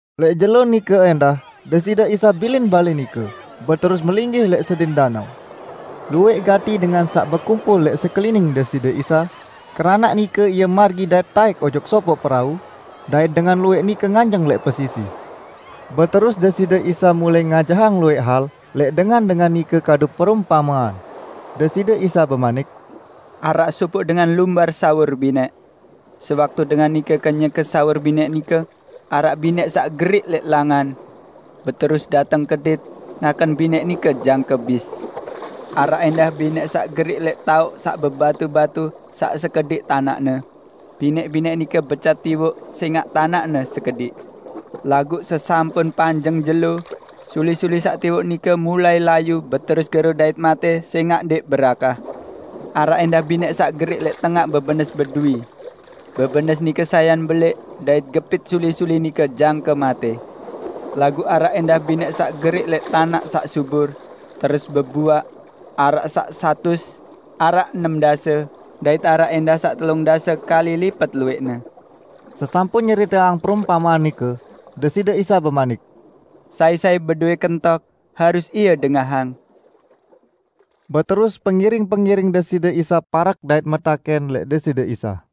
Lẽq jelo nike ẽndah Deside Isa bilin balẽ nike, beterus melinggih lẽq sedin danao. Luwẽq gati dengan saq bekumpul lẽq sekelining Deside Isa, keranaq nike Ie margi dait taẽk ojok sopoq perau, dait dengan luwẽq nike nganjeng lẽq pesisi. Beterus Deside Isa mulai ngajahang luwẽq hal lẽq dengan-dengan nike kadu perumpamean. Deside Isa bemanik, "Araq sopoq dengan lumbar sawur binẽq Sewaktu dengan nike kenyeke sawur binẽq nike, araq binẽq saq geriq lẽq langan. Beterus dateng kedit ngaken binẽq nike jangke bis. Araq ẽndah binẽq saq geriq lẽq taoq saq bebatu-batu saq sekediq tanaqne. Binẽq-binẽq nike becat tiwoq sẽngaq tanaqne sekediq. Laguq sesampun panjeng jelo, suli-suli saq tiwoq nike mulai layu beterus gero dait matẽ sẽngaq ndẽq berakah. Araq ẽndah binẽq saq geriq lẽq tengaq bebenes beduwi. Bebenes nike sayan belẽq dait gepit suli-suli nike jangke matẽ. Laguq araq ẽndah binẽq saq geriq lẽq tanaq saq subur, terus bebuaq; araq saq satus, araq enem dase, dait araq ẽndah saq telung dase kali lipet luwẽqne." Sesampun nyeriteang perumpamean nike, Deside Isa bemanik, "Sai-sai bedowẽ kentok, harus ie dengahang!" Beterus pengiring-pengiring Deside Isa parek dait metakẽn lẽq Deside Isa,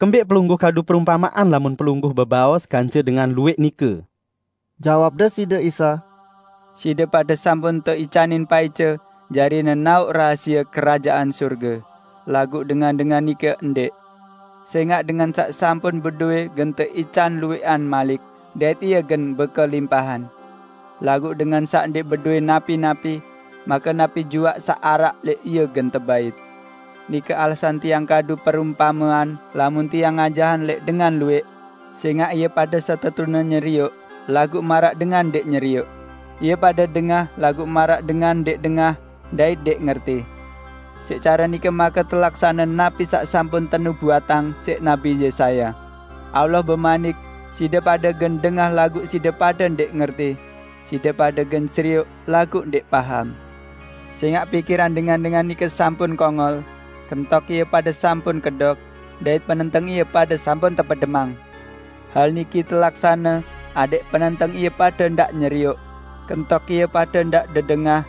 "Kembẽq Pelungguh kadu perumpamean lamun Pelungguh bebaos kance dengan luwẽq nike?" Jawab Deside Isa, "Side pade sampun teicanin paice jari nenaoq rahasie Kerajaan Sorge, laguq dengan-dengan nike ndẽq. Sẽngaq dengan saq sampun bedowẽ gen teican luwẽqan malik, dait ie gen bekelimpahan. Laguq dengan saq ndẽq bedowẽ napi-napi, make napi juaq saq araq lẽq ie gen tebait. Nike alasan Tiang kadu perumpamean lamun Tiang ngajahang lẽq dengan luwẽq, sẽngaq ie pade setetune nyerioq, laguq maraq dengan ndẽq nyerioq; Ie pade dengah laguq maraq dengan ndẽq dengah dait ndẽq ngerti. Siq care nike make telaksane napi saq sampun tenubuatang siq Nabi Yesaya, 'Allah bemanik: Side pade gen dengah laguq side pade ndẽq ngerti; side pade gen serioq laguq ndẽq paham. Sẽngaq pikiran dengan-dengan nike sampun kongol, kentok ie pade sampun kedok dait penenteng ie pade sampun tepedemang. Hal niki telaksane adẽq penenteng ie pade ndaq nyerioq, kentok ie pade ndaq dedengah,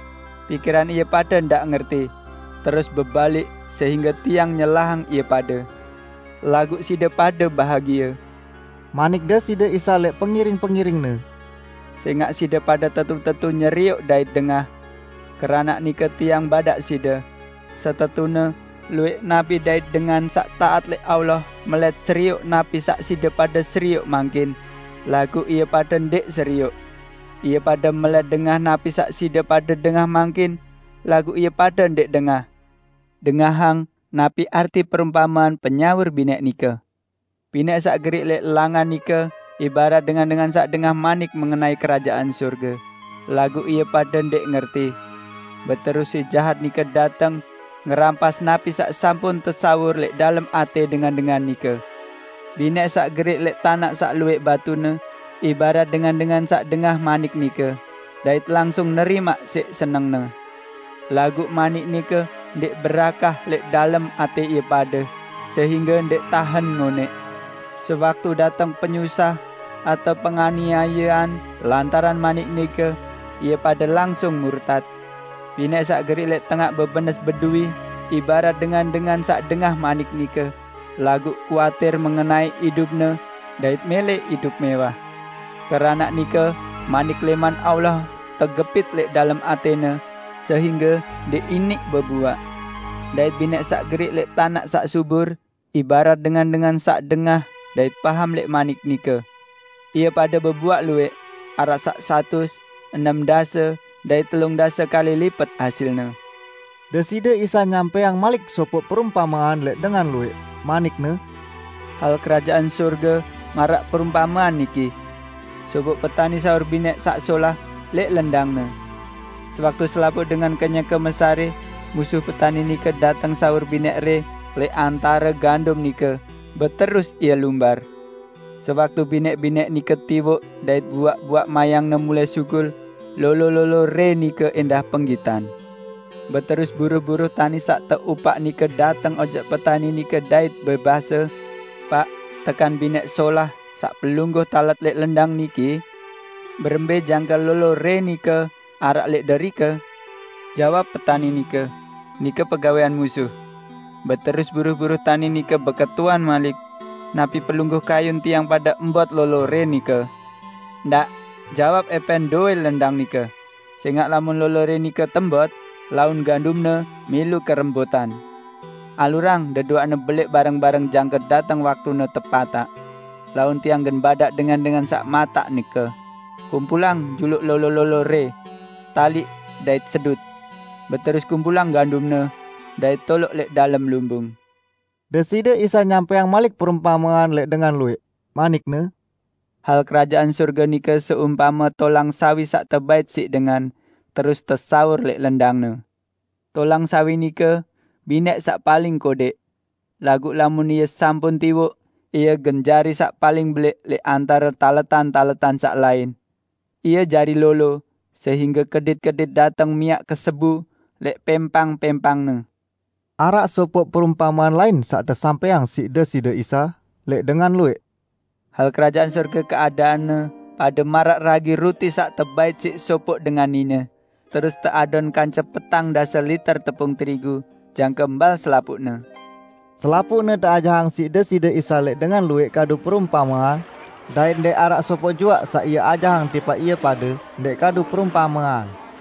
pikiran ie pade ndaq ngerti, terus bebalik, sehingge Tiang nyelahang ie pade.' " "Laguq side pade bahagie," manik Deside Isa lẽq pengiring-pengiring-Ne, "sẽngaq side pade tetu-tetu nyerioq dait dengah. Keranaq nike Tiang badaq side: Setetune luwẽq nabi dait dengan saq taat lẽq Allah melẽt serioq napi saq side pade serioq mangkin, laguq ie pade ndẽq serioq. Ie pade melẽt dengah napi saq side pade dengah mangkin, laguq ie pade ndẽq dengah." "Dengahang napi arti perumpamean penyawur binẽq nike. Binẽq saq geriq lẽq langan nike ibarat dengan-dengan saq dengah manik mengenai Kerajaan Sorge, laguq ie pade ndẽq ngerti. Beterus Si Jahat nike dateng ngerampas napi saq sampun tesawur lẽq dalem atẽ dengan-dengan nike. Binẽq saq geriq lẽq tanaq saq luwẽq batune, ibarat dengan-dengan saq dengah manik nike, dait langsung nerimaq siq senengne. Laguq manik nike ndẽq berakah lẽq dalem atẽ ie pade, sehingge ndẽq tahen ngonẽq. Sewaktu dateng penyusah atao penganiayean lantaran manik nike, ie pade langsung murtat. Binẽq saq geriq lẽq tengaq bebenes beduwi ibarat dengan-dengan saq dengah manik nike, laguq kuatir mengenai idupne dait mẽlẽ idup mẽwah. Keranaq nike manik lẽman Allah tegepit lẽq dalem atẽne sehingge ndẽq iniq bebuaq. Dait binẽq saq geriq lẽq tanaq saq subur ibarat dengan-dengan saq dengah dait paham lẽq manik nike. Ie pade bebuaq luwẽq, araq saq satus, enem dase dait telung dase kali lipet hasilne." Deside Isa nyampẽang malik sopoq perumpamean lẽq dengan luwẽq, manik-Ne, "Hal Kerajaan Sorge maraq perumpamean niki: Sopoq petani sawur binẽq saq solah lẽq lendangne. Sewaktu selapuq dengan kenyeke mesarẽ, musuh petani nike dateng sawur binẽq rẽ lẽq antare gandum nike, beterus ie lumbar. Sewaktu binẽq-binẽq nike tiwoq dait buaq-buaq mayangne mulai sugul, lolo-lolo rẽ nike ẽndah penggitan. Beterus buruh-buruh tani saq teupaq nike dateng ojok petani nike dait bebase, 'Paq, tekan binẽq solah saq pelungguh talet lẽq lendang niki? Berembẽ jangke lolo rẽ nike araq lẽq derike?' Jawab petani nike, 'Nike pegawẽan musuh.' Beterus buruh-buruh tani nike beketuan malik, 'Napi pelungguh kayun tiang pade embot lolo rẽ nike?' 'Ndaq,' jawab ẽpẽn dowẽ lendang nike, 'sẽngaq lamun lolo rẽ nike tembot laun gandumne milu kerembotan. Alurang deduaqne belẽq bareng-bareng jangke dateng waktune tepataq. Laun tiang gen badaq dengan-dengan saq mataq nike: Kumpulang juluq lolo-lolo rẽ, taliq, dait sedut. Beterus kumpulang gandumne dait toloq lẽq dalem lumbung.' " Deside Isa nyampẽang malik perumpamean lẽq dengan luwẽq, manik-Ne, "Hal Kerajaan Sorge nike seumpame tolang sawi saq tebait siq dengan terus tesawur lẽq lendangne. Tolang sawi nike binẽq saq paling kodẽq. Laguq lamun ie sampun tiwoq, ie gen jari saq paling belẽq lẽq antare taletan-taletan saq lain. Ie jari lolo, sehingge kedit-kedit dateng miaq kesebu lẽq pẽmpang-pẽmpangne." Araq sopoq perumpamean lain saq tesampẽang siq Deside Isa, lẽq dengan luwẽq. "Hal Kerajaan Sorge keadaanne pade maraq ragi ruti saq tebait siq sopoq dengan nine, terus teadon kance petang dase liter tepung terigu, jangke mbal selapuqne!" Selapuqne teajahang siq Deside Isa lẽq dengan luwẽq kadu perumpamean, dait ndẽq araq sopoq juaq saq Ie ajahang tipaq ie pade ndẽq kadu perumpamean.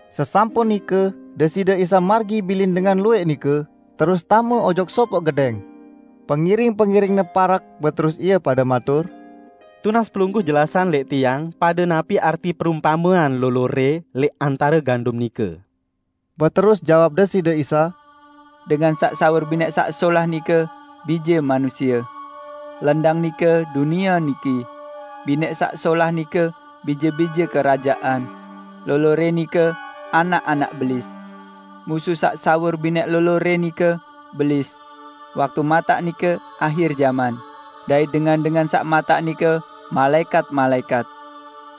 Sesampun nike Deside Isa margi bilin dengan luwẽq nike, terus tame ojok sopoq gedẽng. Pengiring-pengiring-Ne parek beterus ie pade matur, "Tunas Pelungguh jelasang lẽq tiang pade napi arti perumpamean lolo rẽ lẽq antare gandum nike." Beterus jawab Deside Isa, "Dengan saq sawur binẽq saq solah nike, Bije Manusie. Lendang nike dunie niki. Binẽq saq solah nike, bije-bije Kerajaan. Lolo rẽ nike, anak-anak Belis. Musuh saq sawur binẽq lolo rẽ nike, Belis. Waktu mataq nike, ahir jaman, dait dengan-dengan saq mataq nike malaẽkat-malaẽkat.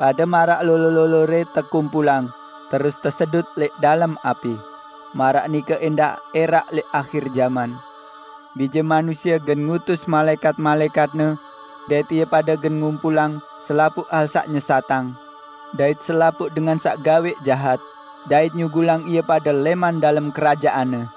Pade maraq lolo-lolo rẽ tekumpulang terus tesedut lẽq dalem api, maraq nike ẽndah ẽraq lẽq ahir jaman. Bije Manusie gen ngutus malaẽkat-malaẽkat-Ne dait ie pade gen ngumpulang selapuq hal saq nyesatang dait selapuq dengan saq gawẽq jahat, dait nyugulang ie pade lẽman dalem Kerajaan-Ne.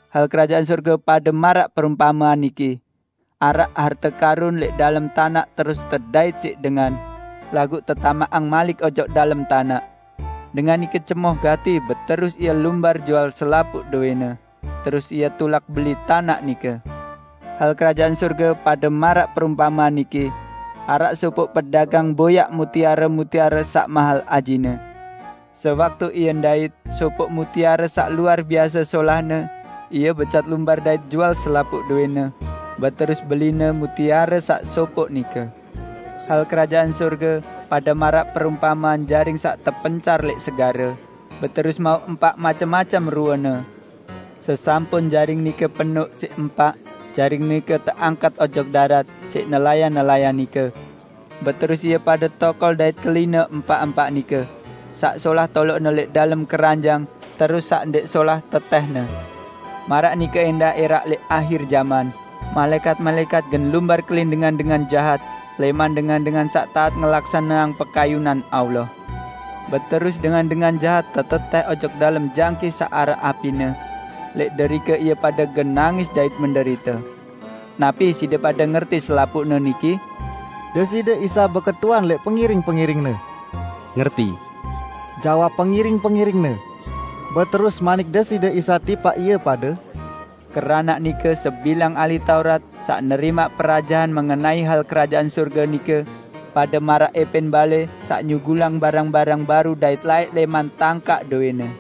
"Hal Kerajaan Sorge pade maraq perumpamean niki: Araq harte karun lẽq dalem tanaq terus tedait siq dengan, laguq tetamaqang malik ojok dalem tanaq. Dengan nike cemoh gati beterus ie lumbar jual selapuq dowẽne, terus ie tulak beli tanaq nike." "Hal Kerajaan Sorge pade maraq perumpamean niki: Araq sopoq pedagang boyaq mutiare-mutiare saq mahel ajine. Sewaktu ie ndait sopoq mutiare saq luar biase solahne, ie becat lumbar dait jual selapuq dowẽne, beterus beline mutiare saq sopoq nike." "Hal Kerajaan Sorge pade maraq perumpamean jaring saq tepencar lẽq segare, beterus mauq empaq macem-macem ruene. Sesampun jaring nike penoq siq empaq, jaring nike teangkat ojok darat siq nelayan-nelayan nike. Beterus ie pade tokol dait kelinne empaq-empaq nike: Saq solah toloqne lẽq dalem keranjang terus saq ndẽq solah tetẽhne. Maraq nike ẽndah ẽraq lẽq ahir jaman, malaẽkat-malaẽkat gen lumbar kelin dengan-dengan jahat lẽman dengan-dengan saq taat ngelaksaneang pekayunan Allah. Beterus dengan-dengan jahat tetetẽh ojok dalem jangkih saq araq apine, lẽq derike ie pade gen nangis dait menderite." "Napi side pade ngerti selapuqne niki?" Deside Isa beketuan lẽq pengiring-pengiring-Ne. "Ngerti!" jawab pengiring-pengiring-Ne. Beterus manik Deside Isa tipaq ie pade, "Keranaq nike sebilang ahli Taurat saq nerimaq perajahan mengenai hal Kerajaan Sorge nike, pade maraq ẽpẽn balẽ saq nyugulang barang-barang baru dait laẽq lẽman tangkaq dowẽne."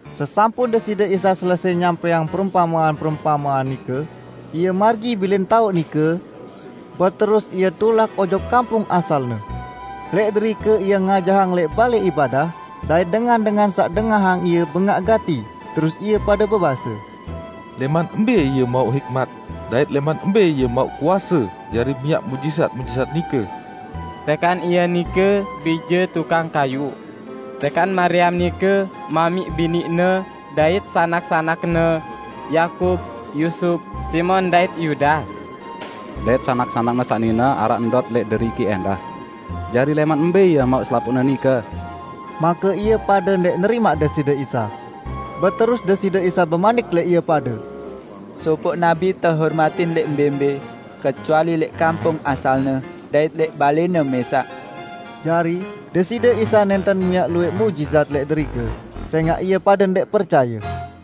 Sesampun Deside Isa selesẽ nyampẽang perumpamean-perumpamean nike, Ie margi bilin taoq nike, beterus Ie tulak ojok kampung asal-Ne. Lẽq derike Ie ngajahang lẽq balẽ ibadah, dait dengan-dengan saq dengahang Ie bengaq gati terus ie pade bebase, "Lẽman mbẽ Ie mauq hikmat dait lẽman mbẽ Ie mauq kuase jari miaq muqjizat-muqjizat nike? Tekan Ie nike bije tukang kayuq? Tekan Mariam nike mamiq bini-Ne, dait sanak-sanak-Ne: Yakub, Yusup, Simon dait Yudas? Dait sanak-sanak-Ne saq nine araq ndot lẽq deriki ẽndah? Jari lẽman mbẽ Ie mauq selapuqne nike?" Make ie pade ndẽq nerimaq Deside Isa. Beterus Deside Isa bemanik lẽq ie pade, "Sopoq nabi tehormatin lẽq mbẽ-mbẽ kecuali lẽq kampung asalne dait lẽq balẽne mẽsaq." Jari, Deside Isa nẽnten miaq luwẽq muqjizat lẽq derike, sẽngaq ie pade ndẽq percaye.